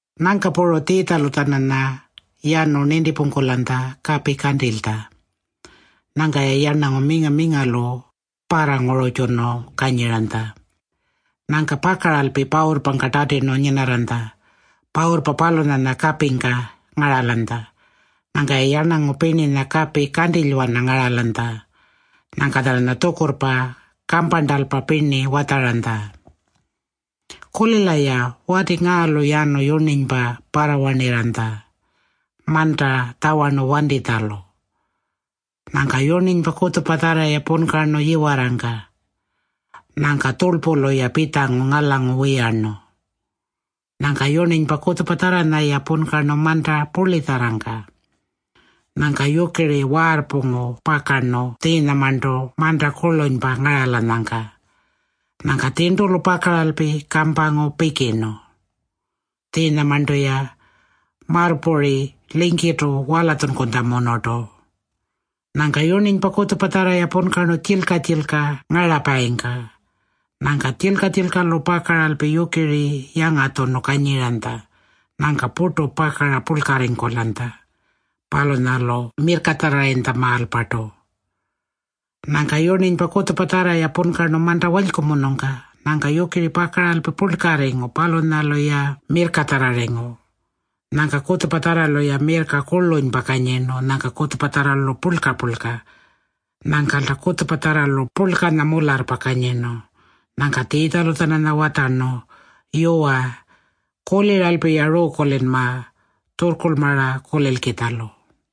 Nyangka puru Tjiitjalu-tjananya yanu nintipungkulanytja kapi kantilytja. Nyangka-ya yarnangu minga-mingalu parrangururrtjunu kanyiranytja. Nyangka pakaralpi pawurrpangka tatirnu nyinarranytja. Pawurrpa palunyanya kapingka ngaralanytja. Nyangka-ya yarnangu pirninya kapi kantilywana ngaralanytja. Nyangka-tjananya tjukurrpa kamparntalpa pirni watjaranytja. “Kulila-ya. Wati ngaalu yanu yurninypa parrawarnirranytja manta tjawarnu wantitjalu. Nyangka yurninypa kutjupatjarra-ya punkarnu yiwarrangka. Nyangka tjurlpulu-ya pitjangu ngalangu wiyarnu. Nyangka yurninypa kutjupatjarranya-ya punkarnu manta purlitjarrangka. Nyangka yukiri waarrpungu pakarnu tjiinyamarntu manta kurlunypa ngaralanyangka. Nyangka tjirntulu pakaralpi kampangu pikirnu. Tjiinyamarntu-ya marrpuri lingkirrtu walatjunkutjamunurtu. Nyangka yurninypa kutjupatjarranya-ya punkarnu tjilka-tjilka ngarapayingka. Nyangka tjilka-tjilkalu pakaralpi yukiri yangatjunu kanyiranytja. Nyangka purtu pakara purlkarringkulanytja. Palunyalu mirrkatjarrarringkutjamaalpartu. Nyangka yurninypa kutjupatjarranya-ya punkarnu manta walykumunungka. Nyangka yukiri pakaralpi purlkarringu. Palunyalu-ya mirrkatjarrarringu. Nyangka kutjupatjarralu-ya mirrka kurlunypa kanyirnu. Nyangka kutjupatjarralu purlka-purlka. Nyangkalta kutjupatjarralu purlkanya mularrpa kanyirnu.” Nyangka Tjiitjalu-tjananya watjarnu, “Yuwa, kuliralpi-ya ruukulinma tjurrkurlmara kulilkitjalu.”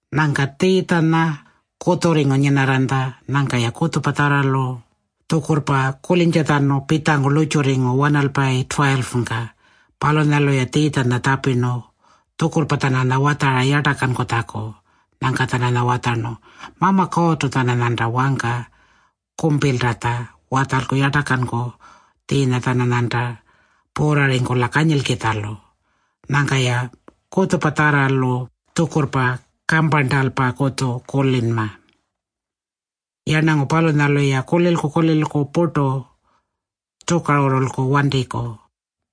Nyangka Tjiitjanya kutjurringu nyinarranytja. Nyangka-ya kutjupatjarralu tjukurrpa kulintjatjanu pitjangu lurrtjurringu wanalpayi 12-pangka. Palunyalu-ya Tjiitjanya tjapirnu tjukurrpa-tjananya watjara yartakankutjaku. Nyangka-tjananya watjarnu, “Mama Kuurrtu-tjananyanta wangka kumpiltatja watjalku yartakanku tjiinya-tjananyanta puurrarringkula kanyilkitjalu. Nyangka-ya kutjupatjarralu tjukurrpa kamparntalpakutju kulinma. ‘Yarnangu palunyalu-ya kulilku-kulilku purtu tjukarurrulku wantiku.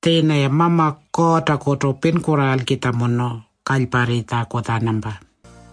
Tjiinya-ya Mama Kuurrtakutu pinkurraalkitjamunu kalyparritjaku-tjanampa.’”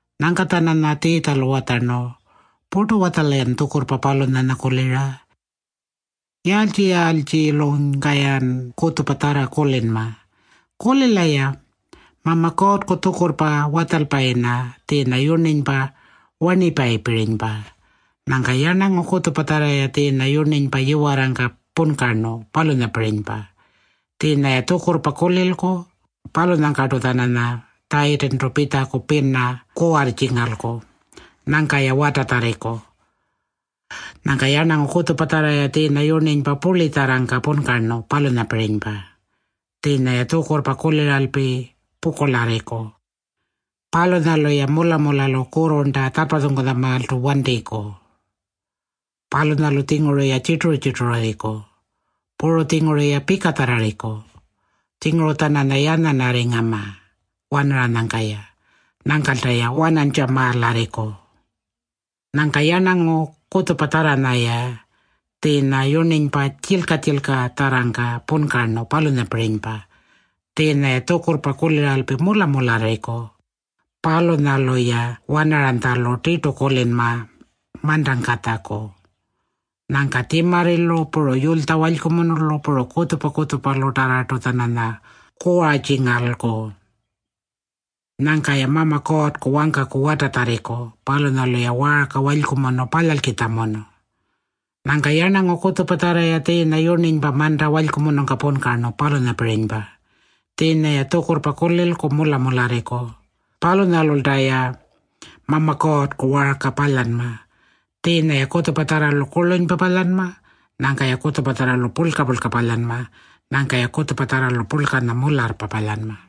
Nyangka-tjananya Tjiitjalu watjarnu, “Purtu-watjala-yan tjukurrpa palunyanya kulira? Yaaltji-yaaltjilunyka-yan kutjupatjarra kulinma? Kulila-ya. Mama Kuurrku tjukurrpa watjalpayinya tjiinya yurninypa warnipayinyapirinypa. Nyangka yarnangu kutjupatjarra-ya tjiinya yurninypa yiwarrangka punkarnu, palunyapirinypa. Tjiinya-ya tjukurrpa kulilku. Palunyangkartu-tjananya Tjayitintu pitjaku pina kuwartjingalku. Nyangka-ya watatjarriku. Nyangka yarnangu kutjupatjarranya-ya tjiinya yurninypa purlitjarrangka punkarnu, palunyapirinypa. Tjiinya-ya tjukurrpa kuliralpi pukurlarriku. Palunyalu-ya mula-mulalu kurrurnta tjarrpatjunkutjamaaltu wantiku. Palunyalu-tjinguru-ya tjirturu-tjirtururriku. Puru-tjinguru-ya pikatjarrarriku. Tjinguru-tjananya yanyanarringama wanaranyangka-ya. Nyangkalta-ya wanantjamaalarriku. Nyangka yarnangu kutjupatjarranya-ya tjiinya yurninypa tjilka-tjilkatjarrangka punkarnu, palunyapirinypa. Tjiinya-ya tjukurrpa kuliralpi mula-mularriku. Palunyalu-ya wanaranytjalu tirtu kulinma mantangkatjaku. Nyangka tjimarrilu, puru yulytja walykumunulu, puru kutjupa-kutjupalutarrartu-tjananya kuwartjingalku. Nyangka-ya Mama Kuurrku wangkaku watatjarriku. Palunyalu-ya waarka walykumunu palyalkitjamunu. Nyangka yarnangu kutjupatjarranya-ya tjiinya yurninypa manta walykumunungka punkarnu, palunyapirinypa. Tjiinya-ya tjukurrpa kulilku mula-mularriku. Palunyalulta-ya Mama Kuurrku waarka palyanma. Tjiinya-ya kutjupatjarralu kurlunypa palyanma. Nyangka-ya kutjupatjarralu purlka-purlka palyanma. Nyangka-ya kutjupatjarralu purlkanya mularrpa palyanma.”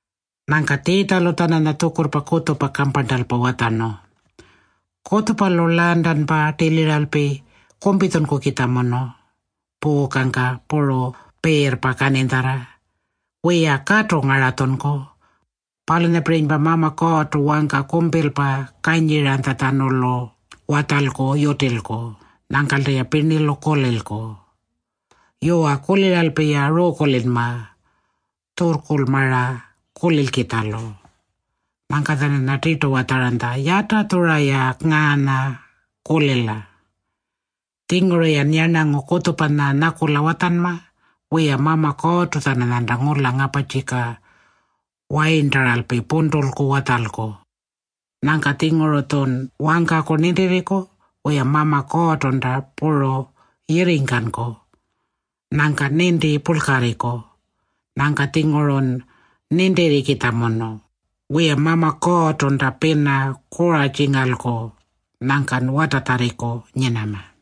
Nyangka Tjiitjalu-tjananya tjukurrpa kutjupa kamparntalpa watjarnu, “Kutjupalu lantanpa tiliralpi kumpitjunkukitjamunu puukangka puru piirrpa kaninytjarra. Wiya, katu ngaratjunku. Palunyapirinypa Mama Kuurrtu wangka kumpilpa kanyiranytjatjanulu watjalku yutilku. Nyangkalta-ya pirnilu kulilku. Yuwa, kuliralpi-ya ruukulinma tjurrkurlmara kulilkitjalu.” Nyangka-tjananya tirtu watjaranytja, “Yatatjura-ya ngaanya kulila. Tjinguru-yan yarnangu kutjupanya nyakula watjanma. Wiya, Mama Kuurrtu-tjananyanta ngula ngaparrtjika wayirntaralpi puntulku watjalku. Nyangka-tjinguru-tjun wangkaku nintirringku. Wiya, Mama Kuurrtunta puru yirringkanku. Nyangkan ninti purlkarringku. Nyangka-tjingurun nintirrikitjamunu. Wiya, Mama Kuurrtunta pina kuwartjingalku. Nyangkan watatjarringku nyinama.”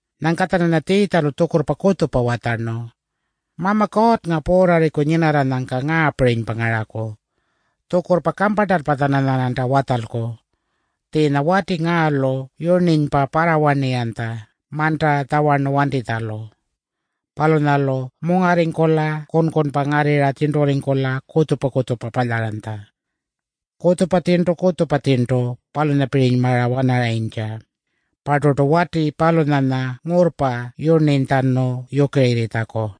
Nyangka-tjananya Tjiitjalu tjukurrpa kutjupa watjarnu, “Mama Kuurrnga puurrarriku nyinarranyangka ngaapirinypa ngaraku. Tjukurrpa kamparntalpa-tjananyarnanta watjalku. Tjiinya wati ngaalu yurninypa parrawarnirranytja manta tjawarnu wantitjalu. Palunyalu mungarringkula kunkunpa ngarrirra tjirnturringkula kutjupa-kutjupa palyaranytja. Tjirntu kutjupa tjirntu palunyapirinymara-wanaranytja. Parturtu wati palunyanya ngurrpa yurninytjanu yukirirritjaku.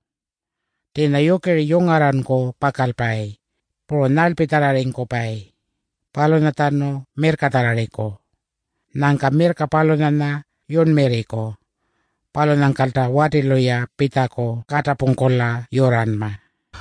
Tjiinya yukiri yungarranku pakalpayi. Puru nyarlpitjarrarringkupayi. Palunyatjanu mirrkatjarrarriku. Nyangka mirrka palunyanya yurnmirriku. Palunyangkalta watilu-ya pitjaku katapungkula yurranma.”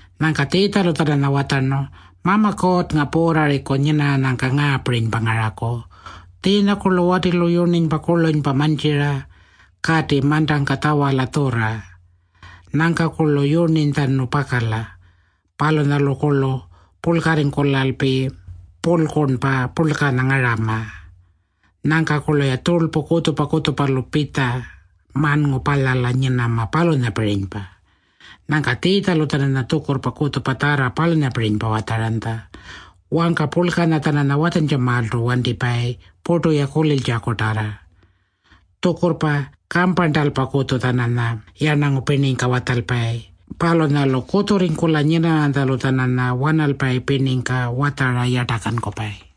Nyangka Tjiitjalu-tjananya watjarnu, “Mama Kuurrnga puurrarriku nyinarranyangka ngaapirinypa ngaraku. Tjiinyakurlu watilu yurninypa kurlunypa mantjira kati mantangka tjawala tjurra. Nyangkakurlu yurninytjanu pakala. Palunyalukurlu purlkarringkulalpi purlkurnpa purlkanya ngarama. Nyangkakurlu-ya tjurlpu kutjupa-kutjupalu pitja manngu palyala nyinama, palunyapirinypa.” Nyangka Tjiitjalu-tjananya tjukurrpa kutjupatjarra palunyapirinypa watjaranytja. Wangka purlkanya-tjananya watjantjamaaltu wantipayi purtu-ya kuliltjakutarra. Tjukurrpa kamparntalpakutju-tjananya yarnangu pirningka watjalpayi. Palunyalu kutjurringkula nyinarranytjalu-tjananya wanalpayi pirningka watjara yartakankupayi.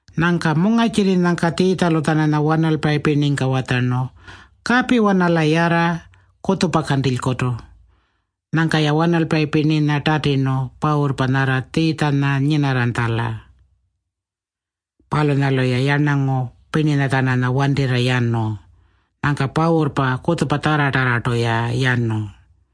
Nyangka mungarrtjirrinyangka Tjiitjalu-tjananya wanalpayi pirningka watjarnu, “Kapiwana-la yarra kutjupa kantilykutu.” Nyangka-ya wanalpayi pirninya tatirnu pawurrpa nyarra Tjiitjanya nyinarranytjala. Palunyalu-ya yarnangu pirninya-tjananya wantirra yanu. Nyangka pawurrpa kutjupatjarratarrartu-ya yanu.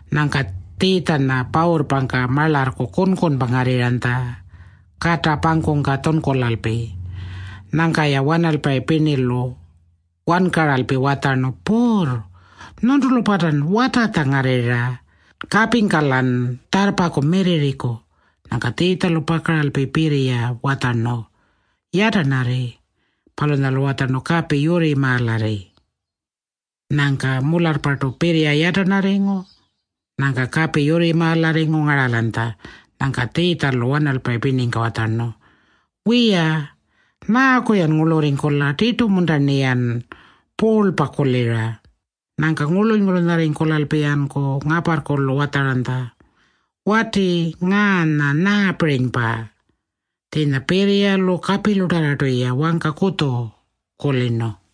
Nyangka Tjiitjanya pawurrpangka marlarrku kunkunpa ngarrirranytja kata pangkungka tjunkulalpi. Nyangka-ya wanalpayi pirnilu wankaralpi watjarnu, “Puurr, nyuntulu-partan watatja ngarrirra? Kapingka-lan tjarrpaku mirrirriku.” Nyangka Tjiitjalu pakaralpi pirriya watjarnu, “Yatarnarri.” Palunyalu watjarnu, “Kapi, yurrimaalarri.” Nyangka mularrpartu pirriya yatarnarringu. Nyangka kapi yurrimaalarringu ngaralanytja. Nyangka Tjiitjalu wanalpayi pirningka watjarnu, “Wiya, nyaaku-yan ngurlurringkula? Tirtu-munta-rniyan puurlpa kulira?” Nyangka ngurluny-ngurlunyarringkulalpi-yanku ngaparrkulu watjaranytja, “Wati ngaanya nyaapirinypa? Tjiinya pirriyalu kapilutarrartu-ya wangka kutju kulirnu.”